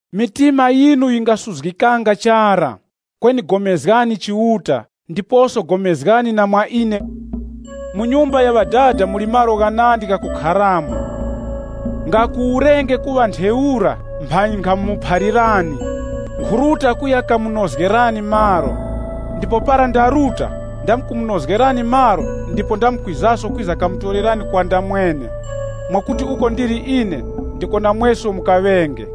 “Mitima yinu yingasuzgikanga chara. Kweni pulikanani na Chiuta, ndipo pulikanani mwa ine. Mu nyumba ya Ŵadada muli malo ghanandi ghakukharamo. Nga kuwurenge kuŵa ntheura, mphanyi nkhamuphalirani. Nkhuruta kuya kamunozgerani malo. Ndipo para ndaruta ndamkumunozgerani malo ndipo ndamkwizaso kwiza kamutorerani kwa ndamwene, mwakuti uko ndili ine ndiko namweso mukaŵenge.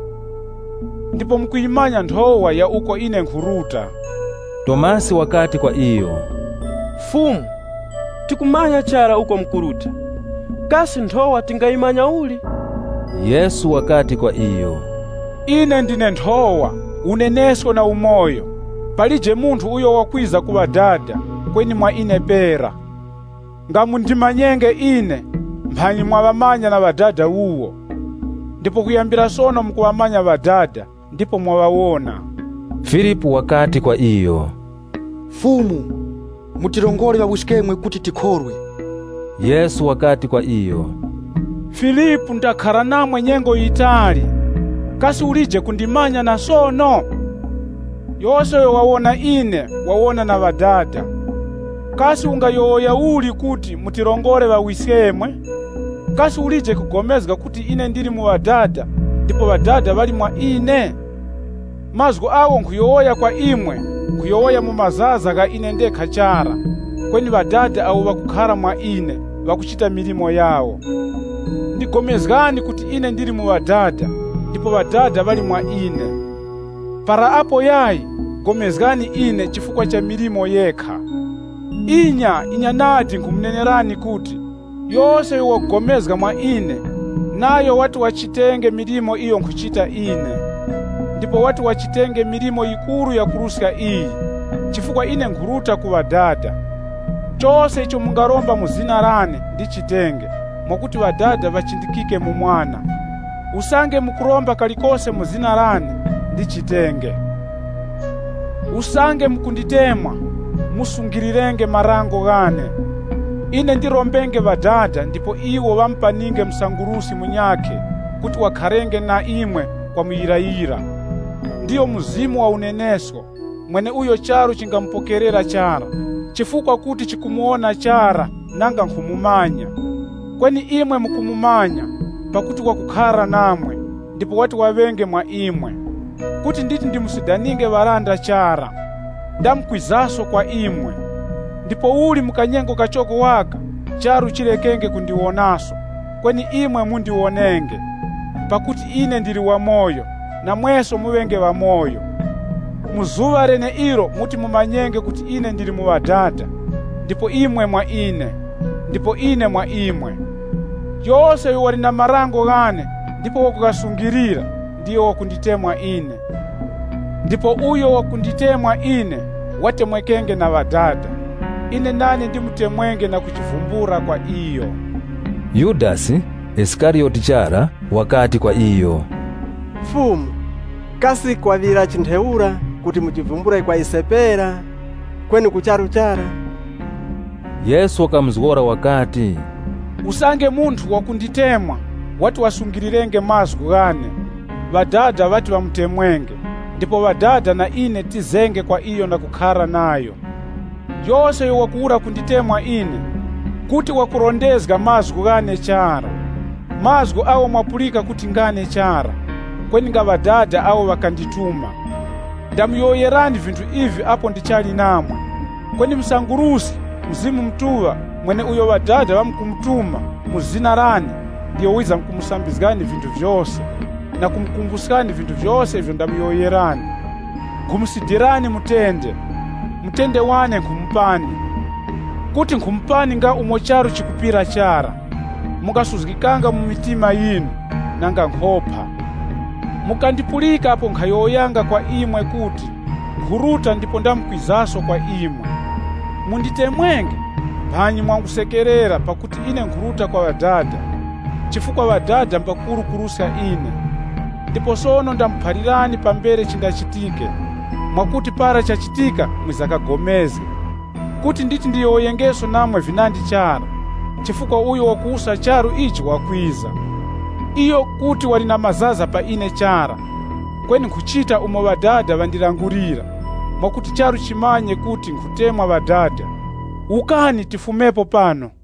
Ndipo mukuyimanya nthowa ya uko ine nkhuruta.” Tomasi wakati kwa iyo, “Fumu, tikumanya chara uko mukuruta. Kasi nthowa tingayimanya uli?” Yesu wakati kwa iyo, “Ine ndine nthowa, unenesko na umoyo. Palije munthu uyo wakwiza ku Ŵadada, kweni mwa ine pera. Nga mundimanyenge ine, mphanyi mwaŵamanya na Ŵadada wuwo. Ndipo kuyambira sono mukuŵamanya Ŵadada ndipo mwaŵawona.” Filipu wakati kwa iyo, “Fumu, mutirongore Ŵawiskemwe kuti tikhorwe.” Yesu wakati kwa iyo, “Filipu, ndakhara namwe nyengo yitali, kasi ulije kundimanya na sono? Yose uyo wawona ine wawona na Ŵadada. Kasi ungayowoya uli kuti ‘Mutirongore Ŵawiskemwe?’ Kasi ulije kupulikana kuti ine ndili mu Ŵadada ndipo Ŵadada ŵali mwa ine? Mazgu agho nkhuyowoya kwa imwe, nkhuyowoya mu mazaza gha ine ndekha chara, kweni Ŵadada awo ŵakukhara mwa ine ŵakuchita milimo yawo. Pulikanani nane kuti ine ndili mu Ŵadada ndipo Ŵadada ŵali mwa ine. Para apo yayi, pulikanani nane chifukwa cha milimo yekha. Inya, inya nadi nkhumunenerani kuti, yose uyo wakupulikana mwa ine, nayo wati wachitenge milimo iyo nkhuchita ine. Ndipo wati wachitenge milimo yikuru yakuruska iyi, chifukwa ine nkhuruta ku Ŵadada. Chose icho mungaromba mu zina lane, ndichitenge, mwakuti Ŵadada ŵachindikike mu Mwana. Usange mukuromba kalikose mu zina lane, ndichitenge. “Usange mukunditemwa, musungilirenge marango ghane. Ine ndirombenge Ŵadada ndipo iwo ŵamupaninge Msanguruski munyakhe kuti wakharenge na imwe kwa muyirayira. Ndiyo Mzimu wa unenesko, mweneuyo charu chingamupokerera chara, chifukwa kuti chikumuwona chara nanga nkhumumanya. Kweni imwe mukumumanya, pakuti wakukhara namwe ndipo wati waŵenge mwa imwe. “Kuti nditi ndimusidaninge ŵalanda chara. Ndamkwizaso kwa imwe. Ndipouli mu kanyengo kachoko waka, charu chilekenge kundiwonaso, kweni imwe mundiwonenge. Pakuti ine ndili wamoyo, namweso muŵenge ŵamoyo. Mu zuŵa leneilo muti mumanyenge kuti ine ndili mu Ŵadada, ndipo imwe mwa ine, ndipo ine mwa imwe. “Yose uyo wali na marango ghane ndipo wakughasungilira ndiyo wakunditemwa ine. Ndipo uyo wakunditemwa ine, watemwekenge na Ŵadada. Ine nane ndimutemwenge na kujivumbula kwa iyo.” Yudasi (Isikariyoti chara) wakati kwa iyo, “Fumu, kasi kwaŵirachi ntheura kuti mujivumbule kwa ise pera, kweni ku charu chara?” Yesu wakamuzgora wakati, Usange munthu wakunditemwa, wati wasungilirenge mazgu ghane, Ŵadada ŵati ŵamutemwenge, ndipo Ŵadada na ine tizenge kwa iyo na kukhara nayo. Yose uyo wakuwura kunditemwa ine, kuti wakurondezga mazgu ghane chara. Mazgu agho mwapulika kuti ngane chara, kweni nga Ŵadada awo ŵakandituma. “Ndamuyowoyerani vinthu ivi apo ndichali namwe. Kweni Msanguruski, Mzimu Mutuŵa, mweneuyo Ŵadada ŵamkumutuma mu zina lane, ndiyo wizamkumusambizgani vinthu vyose, na kumukumbuskani vinthu vyose ivyo ndamuyowoyerani. “Nkhumusidirani mutende. Mutende wane nkhumupani imwe. Kuti nkhumupani nga umo charu chikupira chara. Mungasuzgikanga mu mitima yinu, nanga nkhopa. Mukandipulika apo nkhayowoyanga kwa imwe kuti, ‘Nkhuruta ndipo ndamkwizaso kwa imwe.’ Munditemwenge, mphanyi mwangusekerera pakuti ine nkhuruta kwa Ŵadada, chifukwa Ŵadada mbakuru kuruska ine. Ndipo sono ndamuphalirani pambere chindachitike, mwakuti para chachitika mwiza kapulikane. Kuti nditi ndiyowoyengeso namwe vinandi chara, chifukwa uyo wakuwusa charu ichi wakwiza. Iyo kuti wali na mazaza pa ine chara. Kweni nkhuchita umo Ŵadada ŵandilangulira, mwakuti charu chimanye kuti nkhutemwa Ŵadada. “Wukani, tifumepo pano.